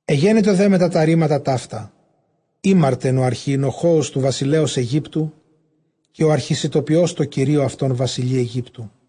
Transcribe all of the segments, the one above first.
Ἐγένετο δὲ μετὰ τὰ ῥήματα ταῦτα, ἥμαρτεν ὁ ἀρχιοινοχόος τοῦ βασιλέως Αἰγύπτου, καὶ ὁ ἀρχισιτοποιὸς, τῷ κυρίῳ αὐτῶν βασιλεῖ Αἰγύπτου.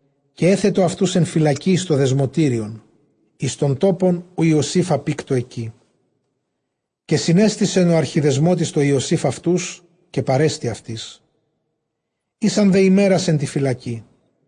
Καὶ ἔθετο αὐτοὺς ἐν φυλακῇ εἰς τὸ δεσμωτήριον, εἰς τὸν τόπον, οὗ Ἰωσὴφ ἀπῆκτο ἐκεῖ. Καὶ συνέστησεν ὁ ἀρχιδεσμώτης τῷ Ἰωσὴφ αὐτούς· καὶ παρέστη αὐτοῖς· ἦσαν δὲ ἡμέρας ἐν τῇ φυλακῇ.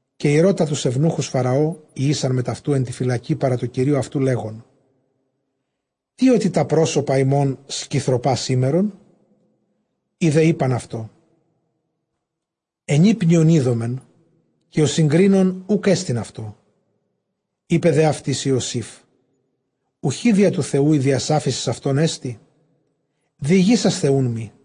Καὶ ἠρώτα τοὺς εὐνούχους Φαραὼ, οἳ ἦσαν μετʼ αὐτοῦ ἐν τῇ φυλακῇ παρὰ τῷ κυρίῳ αὐτοῦ, λέγων, τί ὅτι τὰ πρόσωπα ὑμῶν σκυθρωπὰ σήμερον; Οἱ δὲ εἶπαν αὐτῷ, ἐνύπνιον εἴδομεν, καὶ ὁ συγκρίνων οὐκ ἔστιν αὐτό· εἶπε δὲ αὐτοῖς Ἰωσὴφ, οὐχὶ διὰ τοῦ Θεοῦ ἡ διασάφησις αὐτῶν ἐστι; διηγήσασθε οὖν μοὶ.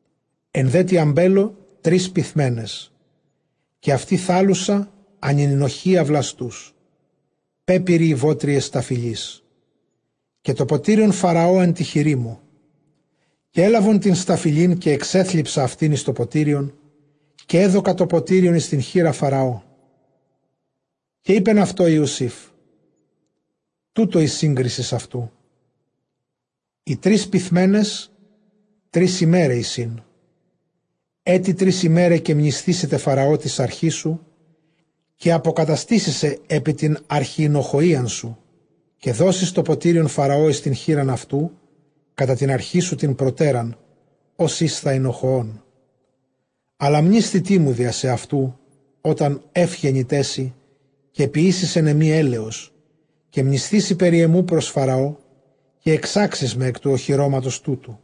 Ἐν δὲ τῇ ἀμπέλῳ τρεῖς πυθμένες, καὶ αὐτὴ θάλλουσα, ἀνενηνοχυῖα βλαστούς· πέπειροι οἱ βότρυες σταφυλῆς. Καὶ τὸ ποτήριον Φαραὼ ἐν τῇ χειρί μου· καὶ ἔλαβον τὴν σταφυλὴν, καὶ ἐξέθλιψα αὐτὴν εἰς τὸ ποτήριον, καὶ ἔδωκα τὸ ποτήριον εἰς τὴν χεῖρα Φαραώ. Καὶ εἶπεν αὐτῷ Ἰωσὴφ, τοῦτο ἡ σύγκρίσις αὐτοῦ· οἱ τρεῖς πυθμένες, τρεῖς ἡμέραι εἰσίν. Ετι τρεῖς ἡμέραι, καὶ μνησθήσεται Φαραὼ τῆς ἀρχῆς σου, καὶ ἀποκαταστήσει σε ἐπὶ τὴν ἀρχιοινοχοΐαν σου, καὶ δώσεις τὸ ποτήριον Φαραὼ εἰς τὴν χεῖρα αὐτοῦ κατὰ τὴν ἀρχήν σου τὴν προτέραν, ὡς ἦσθα οἰνοχοῶν. Ἀλλὰ μνήσθητί μου διὰ σεαυτοῦ, ὅταν εὖ γενηταί σοι· καὶ ποιήσεις ἐν ἐμοὶ ἔλεος· καὶ μνησθήσῃ περὶ ἐμοῦ πρὸς Φαραὼ, καὶ ἐξάξεις με ἐκ τοῦ ὀχυρώματος τούτου.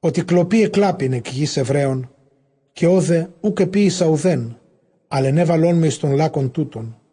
Ὅτι κλοπῇ ἐκλάπην ἐκ γῆς Ἑβραίων, καὶ ὧδε οὐκ ἐποίησα οὐδὲν, ἀλλʼ ἐνέβαλόν με εἰς τὸν λάκκον τοῦτον.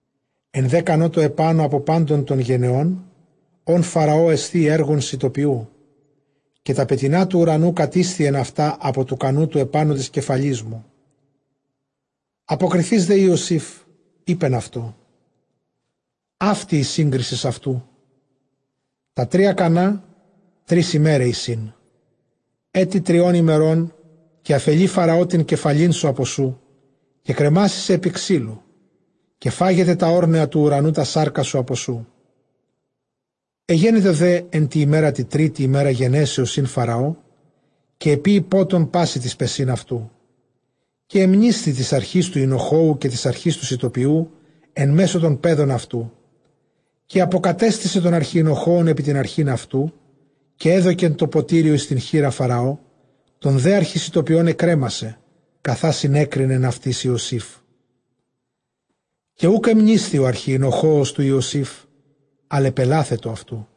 Ἐν δὲ κανῷ τῷ ἐπάνω ἀπὸ πάντων τῶν γενῶν, ὧν Φαραὼ ἐσθίει, ἔργον σιτοποιοῦ, καὶ τὰ πετεινὰ τοῦ οὐρανου κατήσθιεν αὐτὰ ἀπὸ τοῦ κανοῦ τοῦ ἐπάνω τῆς κεφαλῆς μου. Ἀποκριθεὶς δὲ Ἰωσὴφ εἶπεν αὐτῷ, αὕτη ἡ σύγκρισις αὐτοῦ· τὰ τρία κανᾶ, τρεῖς ἡμέραι εἰσίν· Ἔτι τριῶν ἡμερῶν, καὶ ἀφελεῖ Φαραὼ τὴν κεφαλήν σου ἀπὸ σου· καὶ κρεμάσει σε ἐπὶ ξύλου, καὶ φάγεται τὰ ὄρνεα τοῦ οὐρανοῦ τὰς σάρκας σου ἀπὸ σοῦ. Ἐγένετο δὲ ἐν τῇ ἡμέρᾳ τῇ τρίτῃ, ἡμέρα γενέσεως ἦν Φαραὼ, καὶ ἐποίει πότον πᾶσι τοῖς παισὶν αὐτοῦ· καὶ ἐμνήσθη τῆς ἀρχῆς τοῦ οἰνοχόου καὶ τῆς ἀρχῆς τοῦ σιτοποιοῦ ἐν μέσῳ τῶν παίδων αὐτοῦ. Καὶ ἀποκατέστησε τὸν ἀρχιοινοχόον ἐπὶ τὴν ἀρχὴν αὐτοῦ· καὶ ἔδωκε τὸ ποτήριον εἰς τὴν χεῖρα Φαραώ. Τὸν δὲ ἀρχισιτοποιὸν ἐκρέμασεν, καθὰ συνέκρινεν αὐτοῖς Ἰωσήφ. Καὶ οὐκ ἐμνήσθη ὁ ἀρχιοινοχόος τοῦ Ἰωσὴφ, ἀλλαʼ ἐπελάθετο αὐτοῦ.